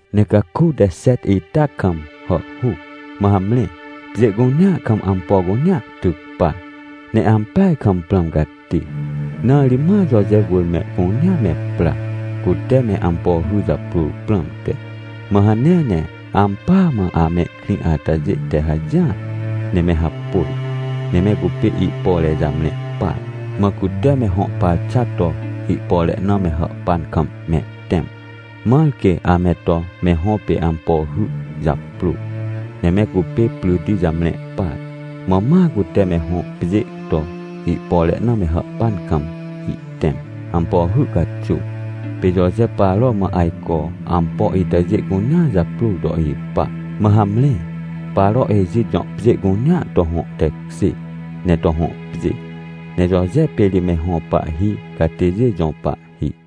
Ne caku te xet ita kam hàhhuc, mã hamre, pjê cunea kam ampo cunea tyc par, ne ampeaj kam prãm cati. Na ri ma Joje wỳr mehcunea me pra, cute me ampo hy japrôr prãmte. Mã hanea ne ampỳa mã amehkrĩ atajê te hajỹar, ne me hapôj. Ne me cupê ihpore jamre par, mã cute me hõ parxa to, ihpore na me hàhpan kam mehtẽm, mãr quê ame to me hõ pê ampo hy japrô. Ne me cupê pryti jamre par, mã ma cute me hõ pjê to, ihpore na me hàhpan kam ihtẽm, ampo hy caxuw. Pê Joje Paro mã ajco ampo itajê cunea japrôr to ipa. Mã hamre, Paro Ejit jõ pjê cunea to hõ tekjê ne to hõ pjê. Ne Joje pê ri me hõ pahhi catêjê jõ pahhi.